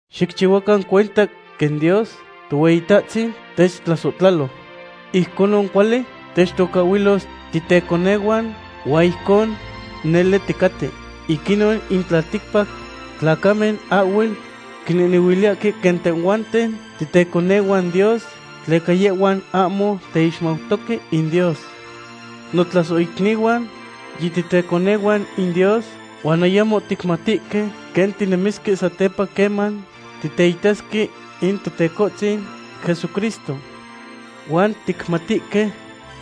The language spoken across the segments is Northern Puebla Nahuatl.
Xicchihuacan cuenta quen Dios Tohueyitahtzin techtlasohtlalo. Ijconon cuali techtocahhuilos titeconehuan, huan ijcon nele ticaten. Ic inon in tlalticpac tlacamen ahhuel quinehnehuiliyahque quen tehhuanten titeconehuan Dios, tleca yehhuan ahmo teixmautoque in Dios. Notlasohicnihuan, yititeconehuan in Dios huan ayamo ticmatihque quen tinemisque satepa queman titeitasque in Totecohtzin Jesucristo. Huan ticmatihque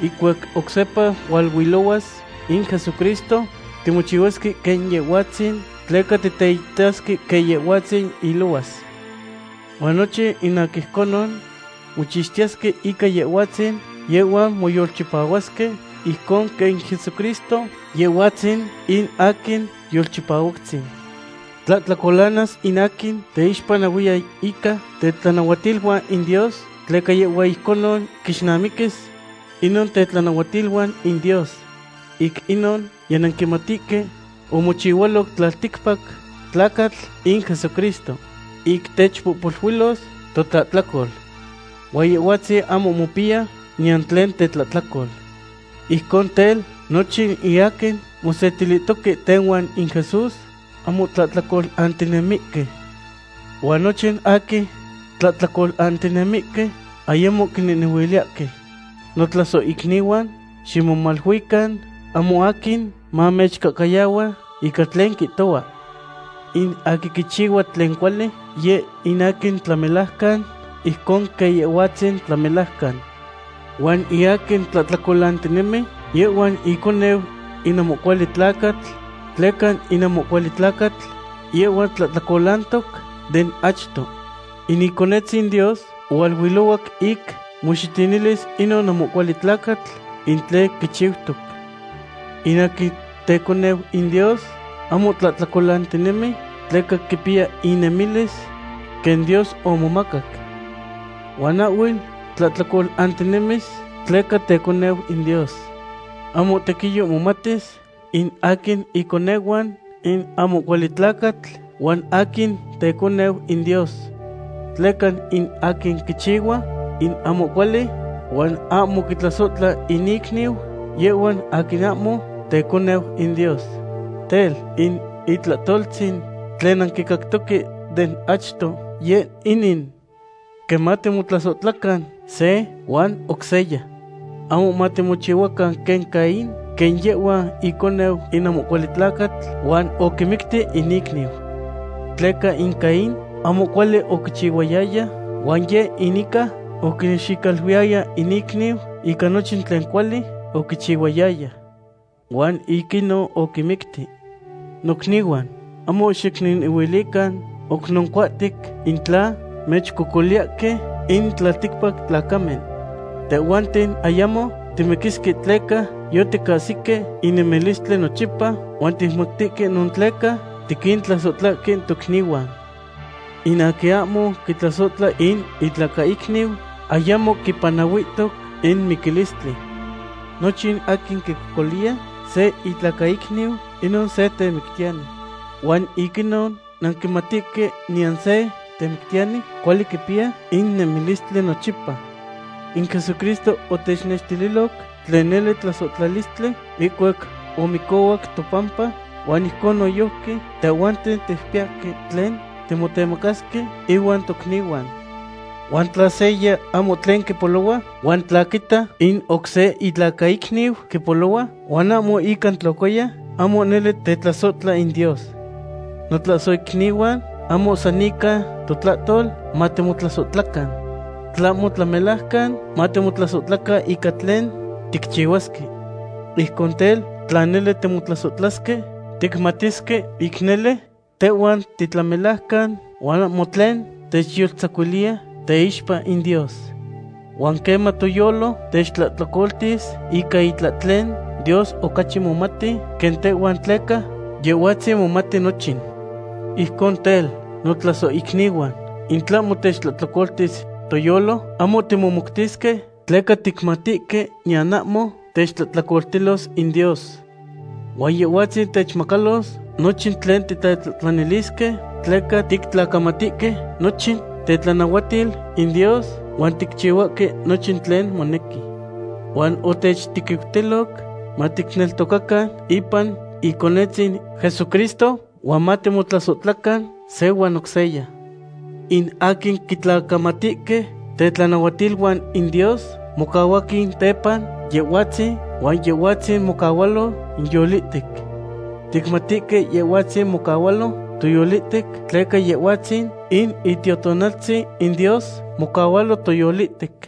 ihcuac oc sepa hualuilohuas in Jesucristo, timochihuasque quen Yehhuatzin, tleca titeitasque quen Yehhuatzin ilohuas. Huan nochin in aquin ijconon mochixtiyesque ica Yehhuatzin, yehhuan moyolchipahuasque ijcon quen in Jesucristo Yehhuatzin in aquin Yolchipahuactzin. Tlahtlacolanas in aquin teyixpanahuiya ica tetlanahuatiluan in Dios, tleca yehhua ijcon quixnamaquis inon tetlanahuatiluan in Dios. Ic inon yinanquimatihque omochihualoc tlalticpac tlacatl in Jesucristo ic techixpohpoluilos totlahtlacol. Huan Yehhuatzin ahmo mopiya niyan tlen tetlahtlacol. Ijcon tel, nochin in aquin mosetilihtoque tehuan in Jesús ahmo tlahtlacolantinemihque. Huan nochin aquin tlahtlacolantinemihque, ayamo quinehnehuiliyahque. Notlasohicnihuan, ximomaluican ahmo aquin mamechcahcayahua ica tlen quihtohua. In aquin quichihua tlen cuali, yeh in aquin tlamelajcan, ijcon quen Yehhuatzin tlamelajcan. Huan in aquin tlahtlacolantinemi, yehhua in iconeu in ahmo cuali tlacatl, tleca in ahmo cuali tlacatl yehhua tlahtlacolantoc den achto. In Iconetzin Dios ohualuilohuac ic moxitinilis inon ahmo cuali tlacatl in tlen quichiutoc. In aquin teconeu in Dios ahmo tlahtlacolantinemi, tleca quipiya inemilis quen Dios omomacac. Huan ahhuel tlahtlacolantinemis tleca teconeu in Dios. Ahmo tequiyo momatis in aquin iconehuan in ahmo cuali tlacatl huan aquin teconeu in Dios. Tleca in aquin quichihua in ahmo cuali huan ahmo quitlasohtla in icniu, yehhua aquin ahmo teconeu in Dios. Tel, in itlahtoltzin tlen nanquicactoque den achto yeh inin: quen matimotlasohtlacan se huan oc seya. Ahmo matimochihuacan quen Caín, quen yehhua iconeu in ahmo cuali tlacatl huan oquimicti in icniu. Tleca in Caín ahmo cuali oquichihuayaya, huan yeh in ica oquinexicaluiyaya in icniu ica nochin tlen cuali oquichihuayaya. Huan ic inon oquimicti. Nocnihuan, ahmo xicnehnehuilican oc noncuahtic in tla mechcocoliyahque in tlalticpac tlacamen. Tehhuanten ayacmo timiquisque tleca yoticahsihque in nemilistli nochipa, huan ticmatihque inon tleca tiquintlasohtlahque tocnihuan. In aquin ahmo quitlasohtla in itlacaicniu ayamo quipanahuihtoc in miquistli. Nochin aquin quicocoliya se itlacaicniu, inon se temictiyani. Huan ic inon nanquimatihque niyan se temictiyani cuali quipiya in nemilistli nochipa. In Jesucristo otechnextililoc tlen nele tlasohtlalistli ihcuac omicohuac topampa, huan ijcon noyojqui tehhuanten ticpiyahque tlen timotemacasque inuan tocnihuan. Huan tla seya ahmo tlen quipolohua, huan tla quita in oc se itlacaicniu quipolohua, huan ahmo ica tlocoya, ahmo nele tetlasohtla in Dios. Notlasohicnihuan, ahmo san ica totlahtol matimotlasohtlacan. Tlahmo tlamelajcan matimotlasohtlacan ican tlen ticchihuasque. Ijcon tel, tla nele timotlasohtlasque, ticmatisque ic nele tehhuan titlamelajcan huan ahmo tlen techyoltzacuiliya teixpa in Dios. Huan queman toyolo techtlahtlacoltis ica itlahtlen, Dios ocachi momati quen tehhuan tleca Yehhuatzin momati nochin. Ijcon tel, notlasohicnihuan, in tlahmo techtlahtlacoltis toyolo, ahmo timomoutisque tleca ticmatihque niyan ahmo techtlahtlacoltilos in Dios. Huan Yehhuatzin techmacalos nochin tlen titetlahtlanilisque, tleca tictlacamatihque nochin tetlanahuatil in Dios huan ticchihuahque nochin tlen monequi. Huan otechtequiutiloc maticneltocacan ipan Iconetzin Jesucristo huan matimotlasohtlacan se huan oc seya. In aquin quitlacamatihque tetlanahuatiluan in Dios mocahuahque tepa Yehhuatzin, huan Yehhuatzin mocahualo inyolihtec. Ticmatihque Yehhuatzin mocahualo toyolihtec, tleca Yehhuatzin in Itiotonaltzin in Dios mocahualo toyolihtec.